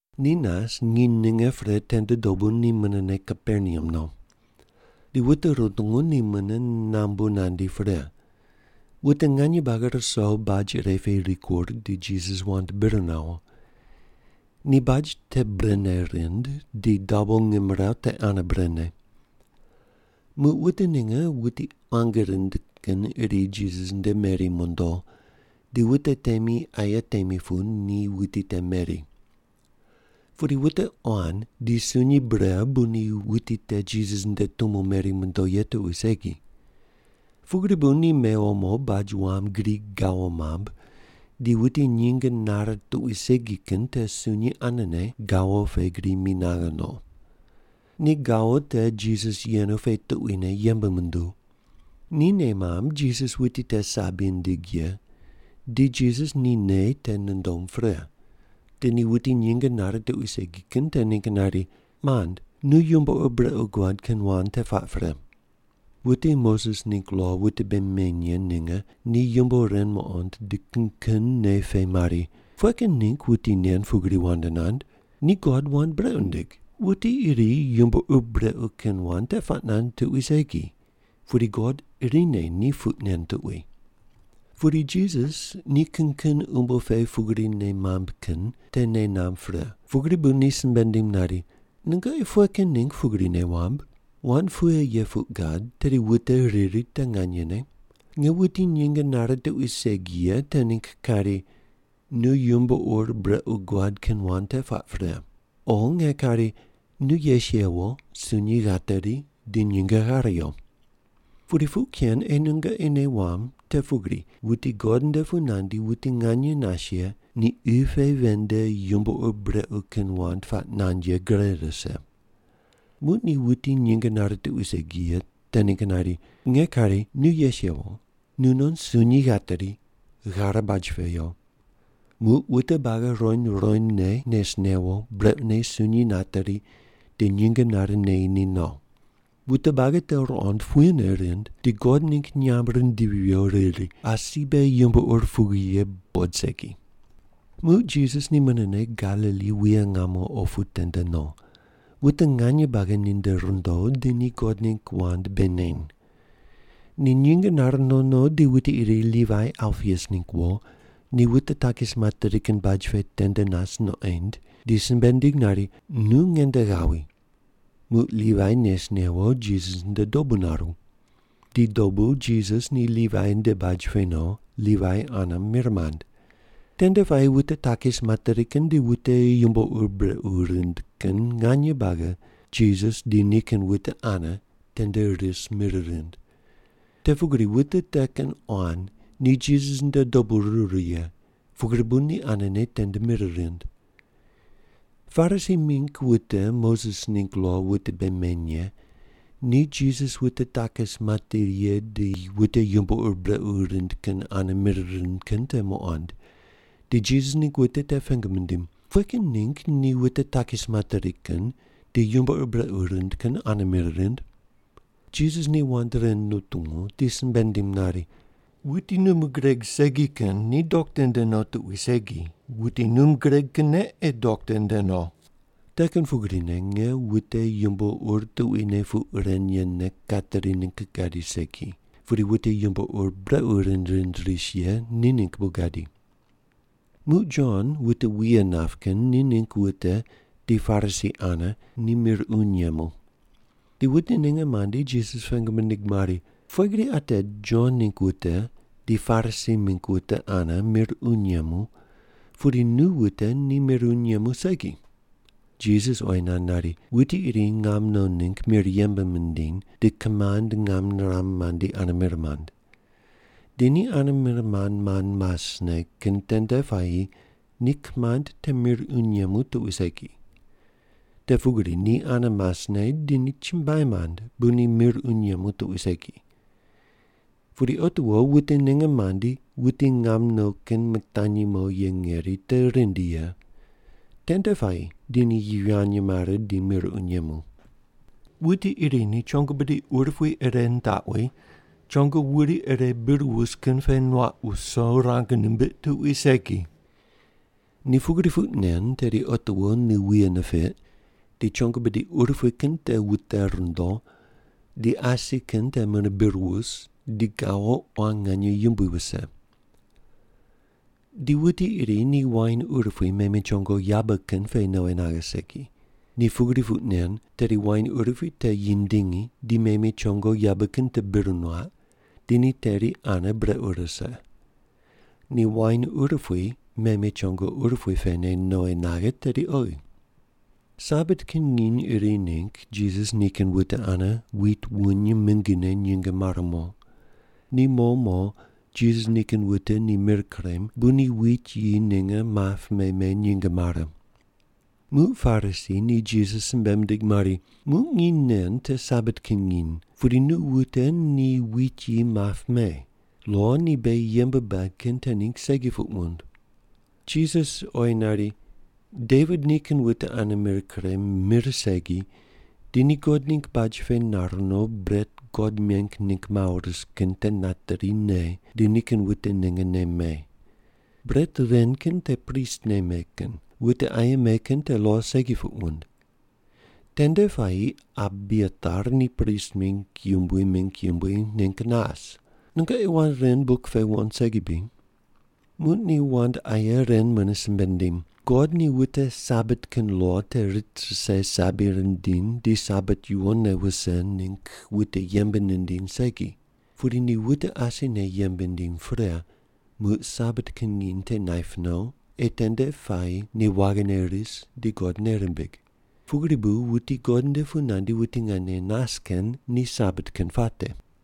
Ni nas nginy ninge pre tende dobu ni munene Kaperneam no. Di wute rutungu ni mune nambu nandi pre. Wute nganye buagi ruso baj iri pe rikur di Jisas wand bir nawo. Ni baj te brene rind, di dabo ngimrawu te ane brene. Muq wute ninge wuti quangi rind kin iri Jisas nde meri mondo, di wute temi aye temi pu ni wuti te meri. Pudi wute quan di sunyi bre bu ni wuti te Jisas nde tumo meri mondo ye tuqui segi. Pugri bu ni mewo mo baj wam gri gawo mamb di wuti nyinge nare tuqui segi kin te sunyi anene gawo pe gri mi naghe no. Ni gawo te Jisas yenu pe tuquine yembe munduw. Ni nei mamb Jisas wuti te sabi nindig ye di Jisas ni nei te nundom pre, di ni wuti nyinge nare tuqui segi kin te ningg nari, “Mand, nu yumbo ur brequ guad kin wand te puaq pre.” Wute Moses ningg lo wute bei meny ye ninge ni yumbo ren muqond di kin kin nei pe mari, “Pughe kin ningg wuti nen pugri wand nand? Ni God wand brequ nindig! Wuti iri yumbo ur brequ kin wand te puaq nand tuqui segi, pudi God irine ni puq nen tuqui.” Pudi Jisas ni kin kin umbo pe pugri nei mamb kin te nei namb pre, pugri bu ni simbe nindim nari, “Nungoqi pughe kin ningg pugri nei wamb? Wand pughe ye puq gad tedi wute riri te nganyene: Nge wuti nyinge nare tuqui segi ye te ningg kari, ‘Nu yumbo ur brequ guad kin wand te puaq pre,’ o nge kari, ‘Nu yes yewo, sunyi ghateri, di nyinge ghare yo?’ Pudi puq ken ei nungoqi nei wamb te pugri wuti God nde pu nandi wuti nganye nas ye ni qi pe ven nde yumbo ur brequ kin wand puaq nand ye gre rise.” Muq ni wuti nyinge nare tuqui segi ye te ningg nari, “Nge kari nu yes yewo, nunon sunyi ghateri, ghare baj pe yo.” Muq wute buagi ruqoind ruqoindne nes newo, brequne sunyi nateri di nyinge nare neyi ni no. Wute buagi te ruqond, puyene rind, di God ningg nyamb rindivi viyo riri, “Asi beghi yumbo ur pugri ye buqod segi.” Muq Jisas ni munene Galili wuye ngamo opu tende no. Wute nganye buagi ninde rundo, di ni God ningg wand bei neny. Ni nyinge nare no no di wuti iri Livai Alpius ningg wo, ni wute takis materi kin baj pe tende nas nuqoind, di simbe nindig nari, “Nu nge nde ghawi.” Muq Livai nes newo, Jisas nde dobu naru. Di dobu Jisas ni Livai nde baj pe no, Livai ane mir mand. Tende puayi wute takis materi kin di wute yumbo ur brequ rind kin nganye buagi Jisas di nikin wute ane tende ris mir rind. Te pugri wute te kin quan ni Jisas nde dobu ruru ye, pugri bu ni anene tende mir rind. Parisi mingg wute Moses ningg lo wute bei meny ye ni Jisas wute takis materi ye di wute yumbo ur brequ rind kin ane mir rind kin te muqond, di Jisas ningg wute te pengu mindim, “Pughe kin ningg ni wute takis materi kin di yumbo ur brequ rind kin ane mir rind?” Jisas ni wand ren nutungu di simbe nindim nari, “Wuti num gureg segi kin ni dokta nde no tuqui segi, wuti num gureg kinne ei dokta nde no. Te kin pugrine nge wute yumbo ur tuquine puq ren yene kateri ningg gadi segi, pudi wute yumbo ur brequ rind rind ris ye ni ningg bu gadi.” Muq Jon wute wuye nap kin ni ningg wute di Parisi ane ni mir uny yemu. Di wute ninge mandi, Jisas pengu mindig mari, “Pughe gri ate Jon ningg wute di Parisi mingg wute ane mir uny yemu, pudi nu wute ni mir uny yemu segi?” Jisas oyi nand nari, “Wuti iri ngam no ningg mir yembe mindiny, di kimand ngam niram mandi ane mir mand. Di ni ane mir mand mand masne kin tende puayi ni kimand te mir uny yemu tuqui segi. Te pugri ni ane masne di ni chumbuai mand bu ni mir uny yemu tuqui segi. Pudi otiwo wute ninge mandi wuti ngam no kin mitanyi mo ye ngeri te rindi ye. Tende puayi di ni yivany mare di mir uny yemu. “Wuti iri ni chongo bidi urupui ire nitaqwi, chongo wuri ire bir wus kin pe nuaq wuso rang nimbiq tuqui segi. Ni pugri puq nen, tedi otiwo ni wuye nipiq di chongo bidi urupui kin te wute rundo, di asi kin te mune bir wus di gawo quan nganye yumbui wuse. Di wuti iri ni wain urupui meme chongo yabe kin pe nowi naghe segi. Ni pugri puq nen, tedi wain urupui te yindingi, di meme chongo yabe kin te bir nuaq, di ni teri ane brequ rise. Ni wain urupui meme chongo urupui pene nowi naghe tedi oghi.” Sabat kin nginy iri ningg Jisas nikin wute ane wit wuny mingine nyinge mare mo. Ni mo mo Jisas nikin wute ni mir kurem, bu ni wit yi ninge map me me nyinge mare. Muq Parisi ni Jisas simbe mindig mari, “Muq nginy nen te Sabat kin nginy, pudi nu wute ni wit yi map me. Lo ni beghi yembe bad kin te ningg segi puq wund.” Jisas oyi nari, “Devit nikin wute ane mir kurem, mir segi, di ni God ningg baj pe nar no, bret God meng ningg mawo ris kin te nateri ne, di nikin wute ninge nem me. Bret ren kin te pristne me kin, wute aye me kin te lo segi puq wund. Tende puayi Abiatar ni prist mingg yumbui mingg yumbui ningg nas. Nungoqi wand ren buk pe wuqond segi bri?” Muq ni wand aye ren mune simbe nindim, “God ni wute Sabat kin lo te rit rise sabi rindiny di Sabat yuwonne wuse ningg wute yembe nindiny segi. Pudi ni wute asine yembe nindiny pre muq Sabat kin nginy te naip no, ei tende puayi ni waghine ris di God nei rimbig. Pugri bu wuti God nde pu nandi wuti nganye nas kin ni Sabat kin puate.”